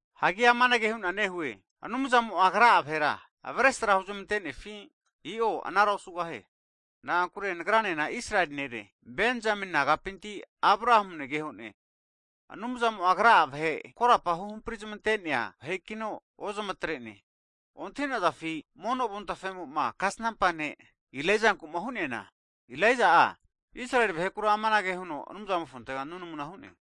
Hagi amanage hu'na nehue, Anumzamo'a Agra'a vahera avesra huzmantenefi? I'o anara osugahie. Na'ankure nagranena Israeli nere, Benzamini nagapinti Abrahamu negehone. Anumzamo'a Agra'a vahe korapa huhampri'zmante'nea vahekino ozmatre'ne. Ontahi'nazafi mono Avontafe'moma kasnampa ne' Ilaijanku'ma hu'neana? Elaija'a Israeli vahekura amanage huno Anumzamofontega nunamuna hu'ne,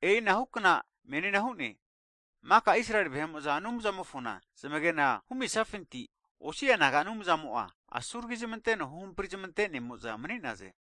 E'inahu kna menina hu'ne. Maka Israeli vahe'mo'za Anumzamofona zamagena humizafinti, osi'a naga Anumzamo'a asuragi zamanteno huhampri zamantenemo'za mani'naze.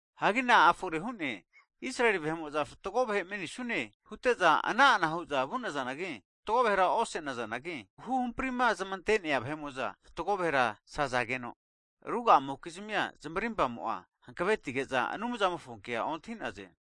Hagi na'a fore hu'ne? Israeli vahe'mo'za fatgo vahe manisune hute'za ana'ana hu'za vu'nazanagi, fatgo vahera osenazanagi, huhamprima zmante'nea vahe'mo'za fatgo vahera sazageno, ruga'amokizmia zmarimpamo'a hanavetige'za, Anumzamofo kea ontahi'naze.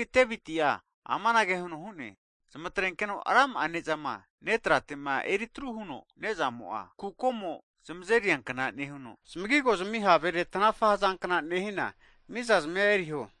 Hagi Devitia amanage huno hu'ne, Zamatrenkeno rama'a ne'zama ne tratema eri atru huno nezamo'a, kukomo zamazeriankna nehuno, zmagigo zmi havere tanafa hazankna nehina mizazmia eriho.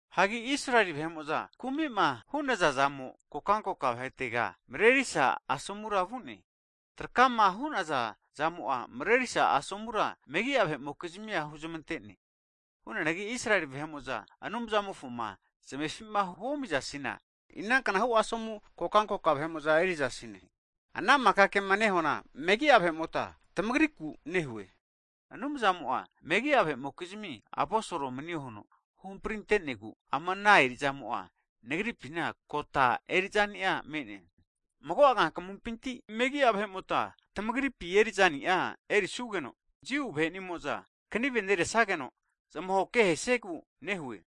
Hagi Israeli vahe'mo'za kumi'ma hu'naza zamo, kokankoka vahetega marerisa asomura vu'ne. Trakama hu'naza zamo'a marerisa asomura megi'a vahe'mokizmia huzmante'ne. Hu'neanagi Israeli vahe'mo'za Anumzamofoma zamefima huomizasina, inanknahu asomu kokankoka vahe'mo'za erizasine. Ana maka kema nehuana, megi'a vahe'mota tamagriku nehue. Anumzamo'a megi'a vahe'mokizmi aposol manio huno huhampri'nantenegu ama ana eri'zamo'a nagripina kota eri'zani'a me'ne. Mago'a kankamumpinti megi'a vahe'mota tamagripi eri'zani'a enerisugeno, Jiu vahe'nimo'za kniveneresageno, zmahoke ahesiegu nehue.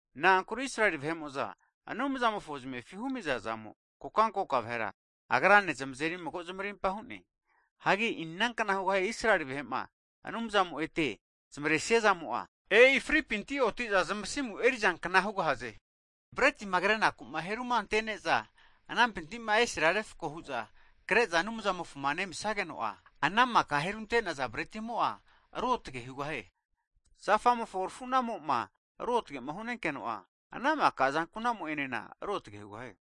Na'ankure Israeli vahe'mo'za Anumzamofo zmefi humiza zamo, kokankoka vahera Agrane zamazeri mago zamarimpa hu'ne. Hagi inankna hugahie Israeli vahe'ma Anumzamo'ma ete zmaresnia zamo'a, e'i fripinti oti'za zamasimu erizankna hugahaze! Bretima krenaku heru'ma anteneza anampintima esema refko hu'za kre'za Anumzamofoma nemisageno'a, ana maka herunte'naza bretimo'a ruotage hugahie. Zafa'mofo rafunamo'ma ruotgema hu'nenkeno'a, ana maka azankunamo'enena ruotge hugahie.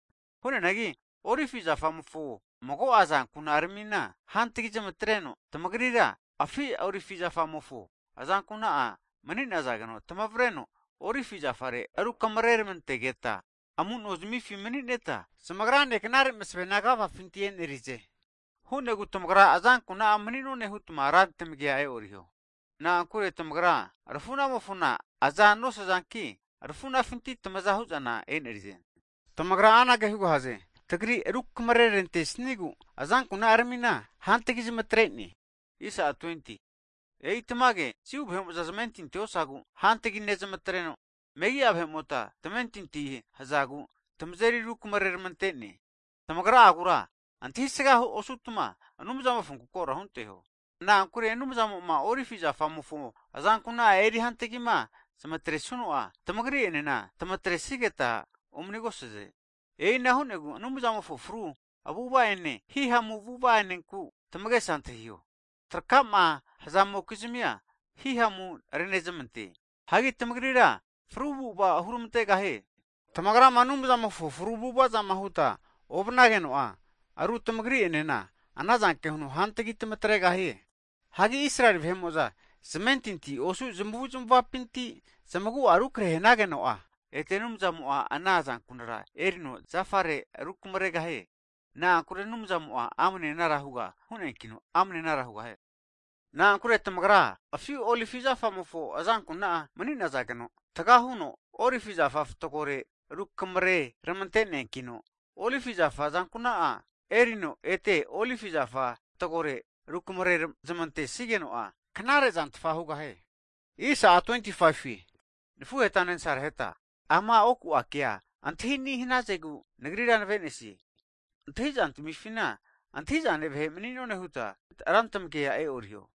Hu'neanagi olivi zafamofo mago'a azankuna'aramina hantagi netreno, tamagrira afi olivi zafamofo azankuna'a mani'nazageno, tamavreno olivi zafare rukamrermantegeta amunozmifi mani'neta, zamagrane knare masavena agafafinti enerize. Hu'negu tamagra azankuna'a mani'none hutma rantmagia e'oriho. Na'ankure tamagra rafunamofona aza nosazanki, arfunafinti tamaza hu'zana enerize. Tamagra anage hugahaze, tagri rukamare'rantesnigu azankuna'aramina hantgi zmatrene. E'i tamage, Jiu vahe'mo'za zamentinti osazagu hantgi netreno, megi'a vahe'mota tamentinti hazagu tamazeri rukamareramante'ne. Tamagra'agura antahisga osutma, Anumzamofonku koro hunteho. Na'ankure Anumzamo'ma olivi zafamofo azankuna'a eri hantgima zamatrenesuno'a, tamagri enena tamatresigeta omanigosaze. E'ina hu'negu Anumzamofo fru avu'ava ene hihamu avu'ava'anenku tamagesa antahiho. Trakama hzamokizmia Anumzamo'a zamazeri haviza nehie. Hianagi tamagrira fru avu'ava hurmantegahie. Tamagrama Anumzamofo fru avu'avazama huta ovanageno'a, ru tamagri'enena ana zanke huno ru hantagi tamatregahie. Hagi Israeli vahe'mo'za zamentinti osu zamavuzmavapinti'ma zamagu'a rukrehe hanageno'a, ete Anumzamo'a ana azankunara erino zafa'arera rukamregahie. Na'ankure Anumzamo'a amne anara huga hu'neankino, amne anara hugahie. Na'ankure tamagra afi olivi zafamofo azankuna'a mani'nazageno, taga huno olivi zafa fatgore rukamreramante'neankino, Olivi zafa azankuna'a erino ete olivi zafa fatgorera rukamare zmantesigeno'a, knarezantfa hugahie. Hagi nafuhetane nasaraheta, ama oku kea antahini hanazegu nagrira nave'nesie. Antahi'zantmifina antahi'zane vahe' mani'none huta rantmagia e'oriho.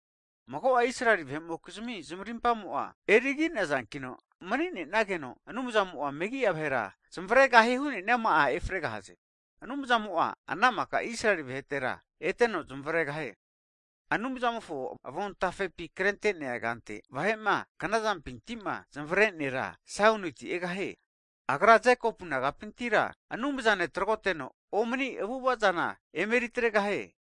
Mago'a Israeli vahe'mokizmi zmarimpamo'a erigineankino, mani'nenageno Anumzamo'a megi'a vahera zamavregahie hu'neama'a efregahaze. Anumzamo'a ana maka Israeli vahera eteno zamavregahie. Anumzamofo avontafepi anage huno krente'ne, Vahe'ma knazampintima zamavre nera, Saioniti egahie. Agra Jekopu nagapintira Anumzane tragoteno omani avu'ava zana emeri atregahie.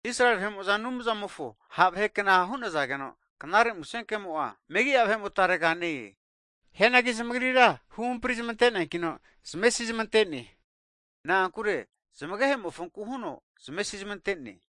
Israeli vahe'mo'za Anumzamofo ha' vahekna hu'nazageno, Knare Musenkemo'a megi'a vahemotarega ne-e. Hianagi zamagrira huhampri zamante'neankino, zamesizmente'ne. Na'ankure zamagehemofonku huno zamesizmante'ne.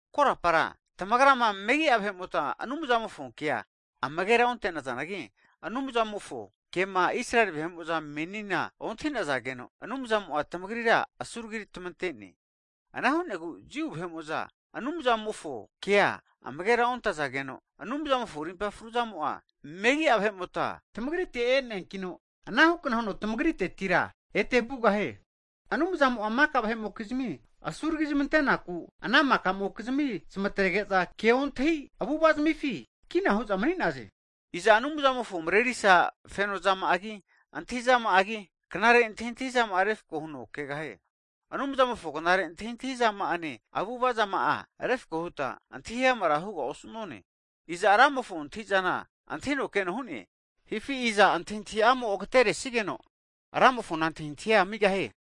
Korapara tamagra megi'a vahe'mota Anumzamofo kea amagera onte'nazanagi, Anumzamofo kema Israeli vahe'mo'za menina ontahizageno, Anumzamo'a tamagrira asuragi tamante'ne. Ana hu'negu Jiu vahe'mo'za Anumzamofo kea amagera ontazageno, Anumzamofo rimpa fruzamo'a megi'a vahe'mota tmagrite e'neankino, ana hukna huno tamagritetira ete vugahie. Anumzamo'a maka vahe'mokizmi asuragizmantenaku ana maka'mokizmi zmatrege'za keontahi avu'avazamifi, kina hu'za mani'naze. Iza Anumzamofo marerisa fenozama'agi, antahizama'agi, knare antahintahizama'anena refko huno kegahie? Anumzamofo knare antahintahizama'ane avu'avazama'a refako huta antahiamara huga osu'none. Iza Ramofo antahi'zana antahino keno hu'ne? Hifi iza antahintahi'amo agaterenesigeno Ramofona antahintahia amigahie?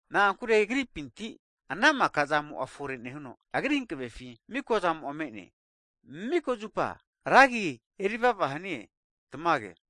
Na'ankure Agripinti ana maka zamo'a fore nehuno, Agri hankavefi mikozamo'a me'ne. Miko zupa Ragi Agra erivava hanie, Tamage.